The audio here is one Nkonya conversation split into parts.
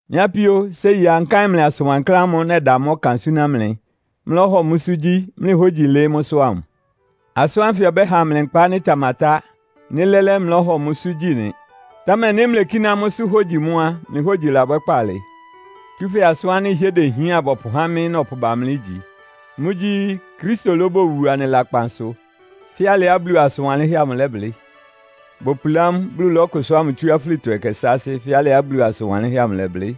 Mɩ́ apíó, séi á, nkáɩn mlɩ asʋn wankláán ámʋ́ʋ́ nɛda mʋ́ ɔkan súná mlɩ, mlɩlɔ́hɔ mʋ́sʋ́ gyí, mlɩ hógyi ɩlɩɩ́ mʋ́sʋ́ ámʋ. Asʋ́n ánfɩ ɔbɛ́ha mlɩ nkpa ánɩ́ ɩtamatá, nɩ́ lɛ́lɛ́ mlɩlɔ́hɔ mʋ́sʋ́ gyí nɩ. Támɛ nɩ́ mlekíná mʋ́sʋ́ hogyi mʋ́ á, mlɩ hógyi labwɛ́ kpaalɩ! Tsúfɛ́ asʋ́n ánɩ́ ɩhɩ́ɛ́ dehián bɔpʋhá mɩ́ nɔpʋba mlɩ ígyi. Mʋ́gyí, Kristo lóbowu anɩ lakpan sʋ, fɛ́ alɩá Bulu asʋn wanlɩ́nhɛ́ amʋ lɛ́blɩ́. Bopulá mʋ, Bulu lɔ́kʋsʋ́a mʋ tsú afúlitɔ ɛkɛ sáásɩ́ fɛ́ alɩá Bulu asʋn wanlɩ́nhɛ́ amʋ ɩlɛblɩ́.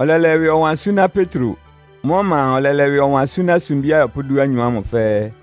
Ɔlɛlɛ ɩwɩ ɔwan súná Petro. Mʋ́ ɔma a, ɔlɛlɛ ɩwɩ ɔwan súná sumbí ayɔpʋ́ dúanyɔ ámʋ fɛ́ɛ́.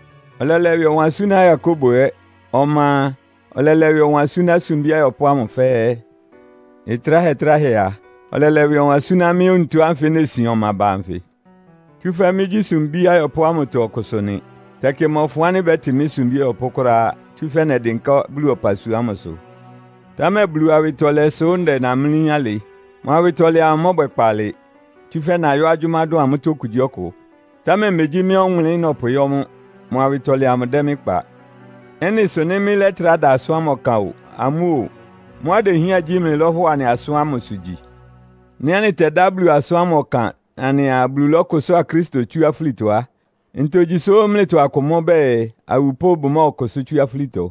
Ɔlɛlɛ ɩwɩ ɔwan súná Yakobo ɛ́. Ɔma a, ɔlɛlɛ ɩwɩ ɔwan súná sumbí ayɔpʋ́ ámʋ fɛ́ɛ́. Ɩtráhɛ-tráhɛ a, ɔlɛlɛ ɩwɩ ɔwan súná mɩ́ onutó ánfɩ nesin ɔma ba anfɩ. Tsúfɛ́ mɩ́gyí sumbí ayɔpʋ́ ámʋtɔ ɔkʋsʋ nɩ. Tɛkɩ mmɔfʋn ánɩ́ bɛ́tɩ mɩ́ sumbí ɔyɔpʋ́ kʋ́ráá, tsúfɛ́ nɛdɩnká Bulu ɔpasua ámʋsʋ. Támɛ Bulu awɩtɔlɛ sʋ́ ndɛ namlí alɩ. Mʋ awɩtɔlɛ amʋ ɩmɔbwɛ kpaalɩ. Tsúfɛ́ nayɔ́ agyʋ́má dʋn amʋ́tɔ́ okugyíɔkʋ. Támɛ megyí mɩ́ ɔwʋnlɩ́n nɔpʋyɔ́ mʋ́. Mʋ awɩtɔlɛ amʋ dɛ́ mɩ́ kpa. Ɩ́nɩ sʋ nɩ́ mɩ́lɛ́trá da asʋ́n ámʋ ɔkan o, amʋ́ o, mʋ́á idehián gyí mlɩlɔ́hɔ anɩ asʋ́n ámʋsʋ gyi. Nɩ́ anɩtɛdá Bulu asʋ́n ámʋ ɔkan anɩaa, Bulu lɔ́kʋsʋ́a Kristo tsú afúlitɔ á, ntogyi sʋ́ mlɩtɔ akʋ mʋ́ bɛɛ, awupʋ́ bʋmɔ́ɔkʋsʋ́ tsú afúlitɔ?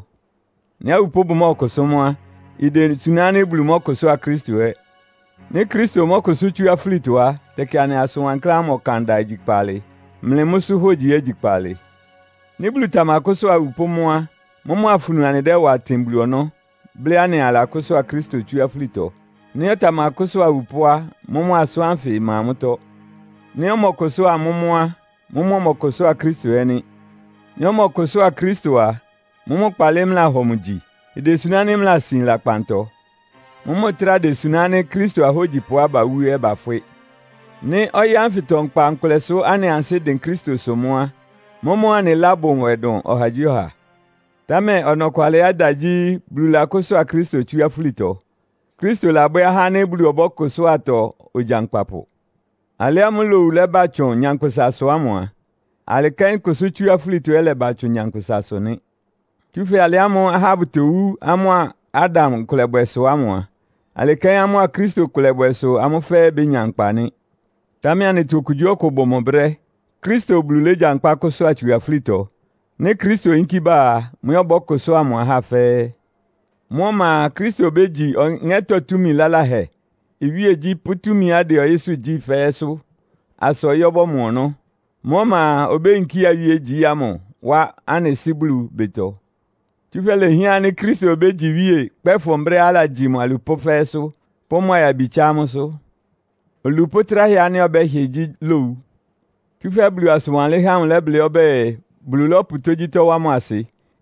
Nɩ́ awupʋ́ bʋmɔ́ɔkʋsʋ́ mʋ́ á, idesuná ánɩ́ Bulu mɔ́kʋsʋ́a Kristo ɛ́. Nɩ́ Kristo mɔ́kʋsʋ́ tsú afúlitɔ á, tɛkɩ anɩ asʋn wankláán amʋ ɔkanda igyi kpaalɩ. Mlɩ mʋ́sʋ́ hogyi ɛ́ igyi kpaalɩ. Nɩ́ Bulu tamakʋ́sʋ́a awupʋ́ mʋ́ á, mʋ́mʋ́ afunu anɩdɛ́wa tɩn Bulu ɔnɔ́, blɩ́ anɩaa alakʋ́sʋ́a Kristo tsú afúlitɔ. Nɩ́ ɔtamakʋ́sʋ́a awupʋ́ á, mʋ́mʋ́ asʋ́n ánfɩ ɩma mʋ́tɔ́. Nɩ́ ɔmɔ́ɔkʋsʋ́a amʋ́ mʋ́ á, mʋ́mʋ́ ɔmɔkʋsʋ́a Kristo ɛ́ nɩ́. Nɩ́ ɔmɔkʋsʋ́a Kristo a, mʋ́mʋ́ kpaalɩ mlɩlahɔ mʋ gyi. Idesuná ánɩ́ mlɩlasin lakpantɔ. Mʋ́mʋ́ ɩtráa desuná ánɩ́ Kristo ahógyipʋá bawú ɛ́ bafwɩ́. Nɩ́ ɔyɩ́ ánfɩtɔ nkpa nkʋlɛsʋ́ anɩ ansɩ́dɩn Kristosʋ mʋ́ á, mʋ́mʋ́ anɩ ɩlá bʋ nwɛ dʋn ɔhagyíɔha. Támɛ ɔnɔkwalɩá ɩda gyí, Bulu lakʋ́sʋ́a Kristo tsú afúlitɔ. Kristo labwɛ́ ahá ánɩ́ Bulu ɔbɔ́kʋsʋ́atɔ ogyankpapʋ. Alɩ ámʋ́ʋ́ lowu lɛ́ba tsʋn nyankpʋsasʋ ámʋ a, alɩ kɛ́n kʋsʋ́ tsú afúlitɔ ɛ́ ɩlɛba tsʋn nyankpʋsasʋ nɩ́. Tsúfɛ́ alɩ ámʋ́ʋ́ ahá bʋtowú amʋ́a Adam ɩkʋlɛbwɛ sʋ ámʋ a, alɩ kɛ́n amʋ́a Kristo ɩkʋlɛbwɛ sʋ amʋ́ fɛ́ɛ́ bénya nkpa nɩ́. Támɛ anɩtɔ okugyíɔkʋ bʋ mʋ brɛ́. Kristo Bulu légyankpá kʋ́sʋ́a tsu afúlitɔ. Nɩ́ Kristo oyínkí bá a, mʋ ɛ́ ɔbɔ́kʋsʋ́a mʋ ahá fɛ́ɛ́. Mʋ́ ɔma a, Kristo obégyi ɔŋɛ́tɔ́ túmi laláhɛ, iwíegyí pʋ́ túmiá ɩdɛ ɔyɩ́sʋ́ gyí fɛ́ɛ́sʋ́ asa ɔyɩ́ ɔbɔ́mɔ ɔnɔ́. Mʋ́ ɔma a, obéyinkía iwíegyí ámʋ wá anɩ Sɩ́ Bulu ɩbɩtɔ. Tsúfɛ́ ilehián ánɩ́ Kristo obégyi iwíe kpɛ́fʋn brɛ́á alagyi mʋ alupʋ́ fɛ́ɛ́sʋ́, pʋ́ mʋ ayabi tsá amʋ́sʋ́. Olupʋ́ tráhɛ ánɩ́ ɔbɛ́hɩ gyí lowu. Tsúfɛ́ Bulu asʋn wanlɩ́nhɛ́ amʋ ɩlɛblɩ́ ɔbɛ́ɛ, “Bulu lɔ́pʋ tógyítɔ́ wá mʋ asɩ.”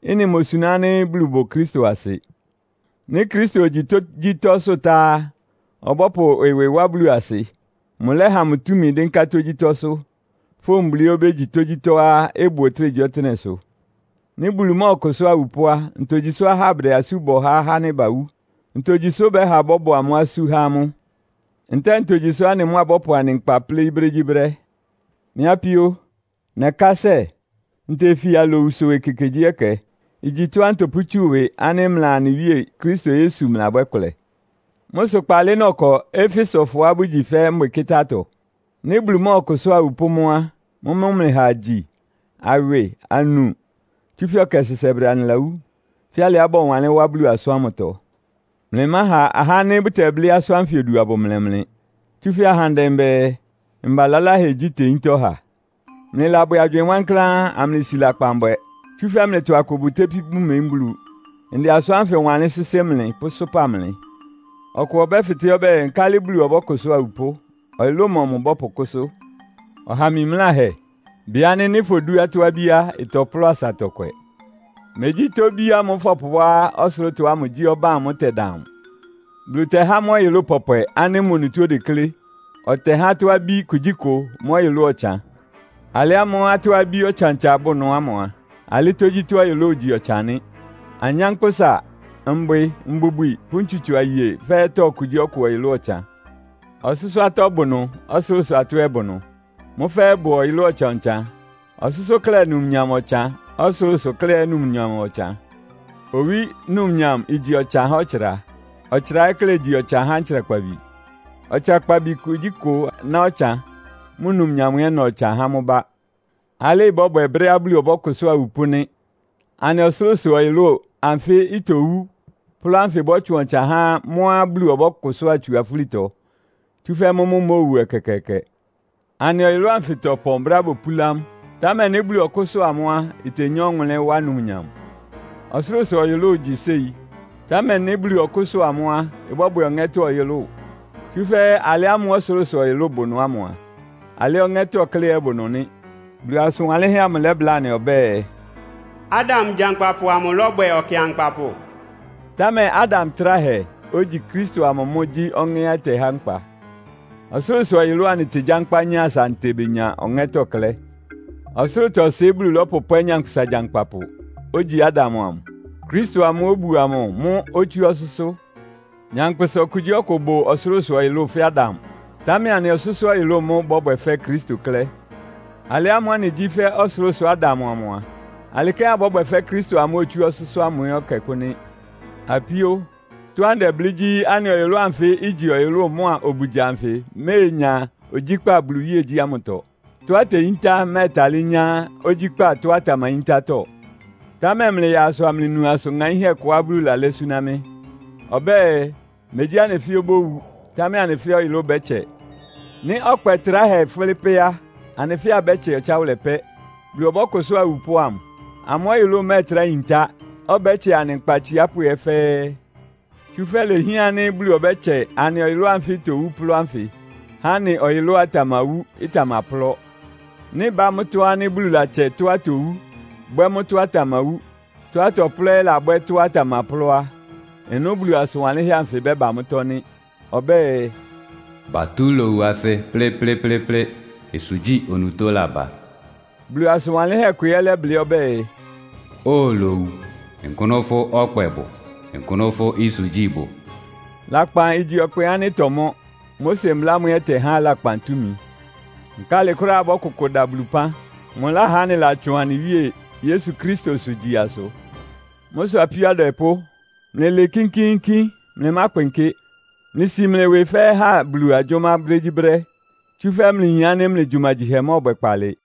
Ɩ́nɩ imosuná ánɩ́ Bulu bʋ Kristo asɩ. Nɩ́ Kristo ogyi tógyítɔ́sʋ́ tá á, ɔbɔ́pʋ ɩwɩ wá Bulu asɩ. Mʋlɛ́ha mʋ túmi dɩ́nká tógyítɔ́sʋ́, fówun Bulu ɛ́ obégyi tógyítɔ́á ɩbʋ ɔtɩ́nɛgyíɔtɩ́nɛ́sʋ́. Nɩ́ Bulu mɔ́ɔkʋsʋ́a awupʋ́ á, ntogyi sʋ́ ahá bʋdɛ asú bɔ há ahá ánɩ́ bawú? Ntogyi sʋ́ bɛ́ha bɔ́bɔ amʋ́ asú há amʋ́? Ntɛ́ɛ ntogyi sʋ́ anɩ mʋ́ abɔ́pʋ anɩ nkpa pléí brégyíbrɛ́? Mɩ́ apíó, nɛkásɛ, ntefia alowusʋ ekekegyíɛkɛ! Igyi tɔ́á ntɔpʋ́tsú ɩwɩ ánɩ́ mlɩa anɩ Wíe Kristo Yesu mlɩlabwɛ́ ɩkʋlɛ. Mʋ́ sʋ kpaalɩ nɔkɔ Efesofɔá bʋgyi fɛ́ mbwɩkɩ́tá-atɔ? Nɩ́ Bulu mɔ́ɔkʋsʋ́a awupʋ́ mʋ́ a, “Mʋ́mʋ́ mlɩha agyi, awɩ, anu, tsúfɛ́ ɔkɛ sɛsɛbrɛ anɩlawú.” Fɛ́ alɩá bɔwanlɩ́n wá Bulu asʋ́n ámʋtɔ. Mlɩmáha ahá ánɩ́ bʋtɛblɩ́ asʋ́n ánfɩ odu abʋmlɛ mlɩ! Tsúfɛ́ ahandɛ bɛɛ, “Mba laláhɛ gyí teyíntá ɔha.” Mlɩlabwɛ agywɩɩn wankláán, amlɩsi lakpan bwɛ. Tsúfɛ́ mlɩtɔ akʋ bʋtépí bʋmeyín Bulu. Ndɛ asʋ́n ánfɩ wanlɩ́n sɩ́sɩ́ mlɩ pʋ́sʋ́pa mlɩ. Ɔkʋ ɔbɛ́fɩtɛ́ ɔbɛ́ɛ, “Nkálɩ Bulu ɔbɔ́kʋsʋ́a awupʋ́? Ɔyʋlʋ́ʋ mɔmʋ bɔ́pʋkʋ́sʋ́?” Ɔha mimláhɛ! Bɩ ánɩ́ nɩ́ fodú atɔ́-abí á, ɩtɔplɔ́ asa ɩtɔkwɛ. Megyí itóbí ámʋ́ʋ́ fɔpʋwá ɔsʋlʋ́tɔ ámʋ gyí ɔbán amʋ́ʋ́ ɩtɛdan amʋ. Bulu tɛhá mʋ́ ɔyʋlʋ́ʋ pɔpwɛ ánɩ́ mʋ onutó odeklé. Ɔtɛhá atɔ́-abí kugyíkʋ mʋ́ ɔyʋlʋ́ʋ ɔtsan. Alɩ ámʋ́ʋ́ atɔ́-abí ɔtsan-ɔtsan bʋ́ʋ ɩnʋ ámʋ a, alɩ́ tógyítɔ́ ɔyʋlʋ́ʋ igyi ɔtsan nɩ́. Anyánkpʋ́sa, mbwɩ, mbubwi pʋ́ ntsutso aye fɛ́ɛ́tɔ́ okugyíɔkʋ ɔyʋlʋ́ʋ ɔtsan. Ɔsʋ́sʋ́-atɔ́ bʋ ɩnʋ, ɔsʋlʋ́sʋ-atɔ́ ɛ́ bʋ ɩnʋ. Mʋ́ fɛ́ɛ́ ɩbʋ ɔyʋlʋ́ʋ ɔtsan-ɔtsan. Ɔsʋ́sʋ́ klɛ́ numnyam ɔtsan, ɔsʋlʋ́sʋ klɛ́ ɛ́ numnyam ɔtsan. Owí numnyam igyi ɔtsan há ɔtsra. Ɔtsra klɛ́ ɛ́ igyi ɔtsan há ntsrakpabi. Ɔtsrakpabi kugyíkʋ ná ɔtsan, mʋ́ numnyam ɛ́ ɩna ɔtsan há mʋ́ bá. Alɩ ɩbɔ́bwɛ brɛ́á Bulu ɔbɔ́kʋsʋ́a awupʋ́ nɩ́. Anɩ ɔsʋlʋ́sʋ-ɔyʋlʋ́ʋ anfɩ́ itowú, plɔ́ ánfɩ ɩbɔ́tsʋn ɔtsan há mʋ́á Bulu ɔbɔ́kʋsʋ́a tsu afúlitɔ, tsúfɛ́ mʋ́ mʋ́ imóowu ɛkɛkɛɛkɛ. Anɩ ɔyʋlʋ́ʋ anfɩ tɔpɔn brɛ́á bopúlá mʋ́, támɛ nɩ́ Bulu ɔkʋ́sʋ́a mʋ́ á, itenyá ɔwʋnlɩ́n, wá numnyam. Ɔsʋlʋ́sʋ-ɔyʋlʋ́ʋ igyi séi, támɛ nɩ́ Bulu ɔkʋ́sʋ́a mʋ́ á, ɩbɔ́bwɛ ɔŋɛ́tɔ́ ɔyʋlʋ́ʋ. Tsúfɛ́ alɩ ámʋ́ʋ́ ɔsʋlʋ́sʋ-ɔyʋlʋ́ʋ bʋ ɩnʋ ámʋ á, alɩ́ ɔŋɛ́tɔ́ klɛ́ ɛ́ bʋ ɩnʋ nɩ́. Bulu asʋn wanlɩ́nhɛ́ amʋ lɛ́bláa anɩ ɔbɛ́ɛ, “Adam gyankpapʋ amʋ lɔ́bwɛ ɔkɩankpapʋ.” Támɛ Adam tráhɛ, ogyi Kristo amʋ mʋ́ gyí Ɔŋɛ́á ɔtɛhá nkpa. Ɔsʋlʋ́sʋ-ɔyʋlʋ́ʋ anɩtegyankpá nyá asa anɩtebenya ɔŋɛ́tɔ́ klɛ́. Ɔsʋlʋ́tɔ-ɩsɩ Bulu lɔ́pʋpwɛ́ nyankpʋsa gyankpapʋ, ogyi Adam amʋ. Kristo, amʋ́ʋ́ obuo amʋ mʋ́ otsú ɔsʋ́sʋ́. Nyankpʋsa okugyíɔkʋ bʋ ɔsʋlʋ́sʋ-ɔyʋlʋ́ʋ fɛ́ Adam, támɛ anɩ ɔsʋ́sʋ́-ɔyʋlʋ́ʋ mʋ́ bɔ́bwɛ fɛ́ Kristo klɛ́. Alɩ ámʋ́ʋ́ anɩgyí fɛ́ ɔsʋlʋ́sʋ Adam amʋ a, alɩ kɛ́n abɔ́bwɛ fɛ́ Kristo amʋ́ʋ́ otsú ɔsʋ́sʋ́ ámʋ ɛ́ ɛkɛkʋ́ nɩ́. Apíó, tɔ́á ndɛblɩ́ gyí, anɩ ɔyʋlʋ́ʋ anfɩ́ igyi ɔyʋlʋ́ʋ mʋ́a obugya anfɩ iméenya ogyíkpá Bulu iwíegyí ámʋtɔ. Tɔ́á iteyíntá ɩmɛ́ɛtalɩ́ nyá ogyíkpá tɔ́á ɩtamayíntátɔ́. Támɛ mlɩyaa asʋ amlɩnu asʋn ŋaínhɛ́ kʋá Bulu lalɛ́ súná mɩ́. Ɔbɛ́ɛ, megyí anɩ fɛ́ɛ́ obówu, támɛ anɩ fɛ́ɛ́ ɔyʋlʋ́ʋ bɛ́tsɛ. Nɩ́ ɔkpɛ tráhɛ ɩfʋ́lɩ́ pɛ́ á, anɩ fɛ́ɛ́ abɛ́tsɛ ɔtsáwʋlɛ pɛ́. Bulu ɔbɔ́kʋsʋ́a awupʋ́ ámʋ. Amʋ́ ɔyʋlʋ́ʋ ɩmɛ́ɛtrá yintá, ɔbɛ́tsɛ anɩ nkpa atsiápʋ́ ɛ́ fɛ́ɛ́. Tsúfɛ́ ilehián ánɩ́ Bulu ɔbɛ́tsɛ anɩ ɔyʋlʋ́ʋ anfɩ́ itowú plɔ́ ánfɩ, há anɩ ɔyʋlʋ́á ɩtamawú, ɩtamaplɔ́. Nɩ́ ɩbá mʋ́tɔ́ ánɩ́ Bulu latsɛ tɔ́á itowú, bwɛ́ mʋ́ tɔ́á ɩtamawú, tɔ́á ɩtɔplɔ́ ɛ́ lábwɛ́ tɔ́á ɩtamaplɔ́ á, ɩnʋ́ Bulu asʋn wanlɩ́nhɛ́ anfɩ ɩbɛ́ba mʋ́tɔ́ nɩ́. Ɔbɛ́ɛ, “Batú lowu asɩ plɩ́plɩ́plɩ́plɩ́. Ɩsʋgyí onutó laba.” Bulu asʋn wanlɩ́nhɛ́ kʋ ɛ́ lɛ́blɩ́ ɔbɛ́ɛ, “Óo lowu, nkʋ́nʋ fʋ́ ɔkpɛ bʋ? Nkʋ́nʋ́ fʋ́ ɩsʋgyí bʋ?” Lakpan igyi ɔkpɛ ánɩ́ ɩtɔmɔ́, Mose mbla ámʋ ɛ́ ɩtɛhá lakpan túmi. Nkálɩ kʋ́ráá abɔ́kʋkʋ da Bulu ɩpán? Mʋláhá anɩlatsʋn anɩ Wíe Yesu Kristosʋ gyi asʋ. Mʋ́ sʋ apíó adwɛpʋ́, mlɩlɩɩ kínkíínkín, mlɩmákpɩnkɩ́. Mlɩsi mlɩ ɩwɩ fɛ́ɛ́ ha Bulu agyʋ́má brégyíbrɛ́, tsúfɛ́ mlɩyin ánɩ́ mlɩ gyumagyihɛ mɔ́ɔbwɛ kpaalɩ.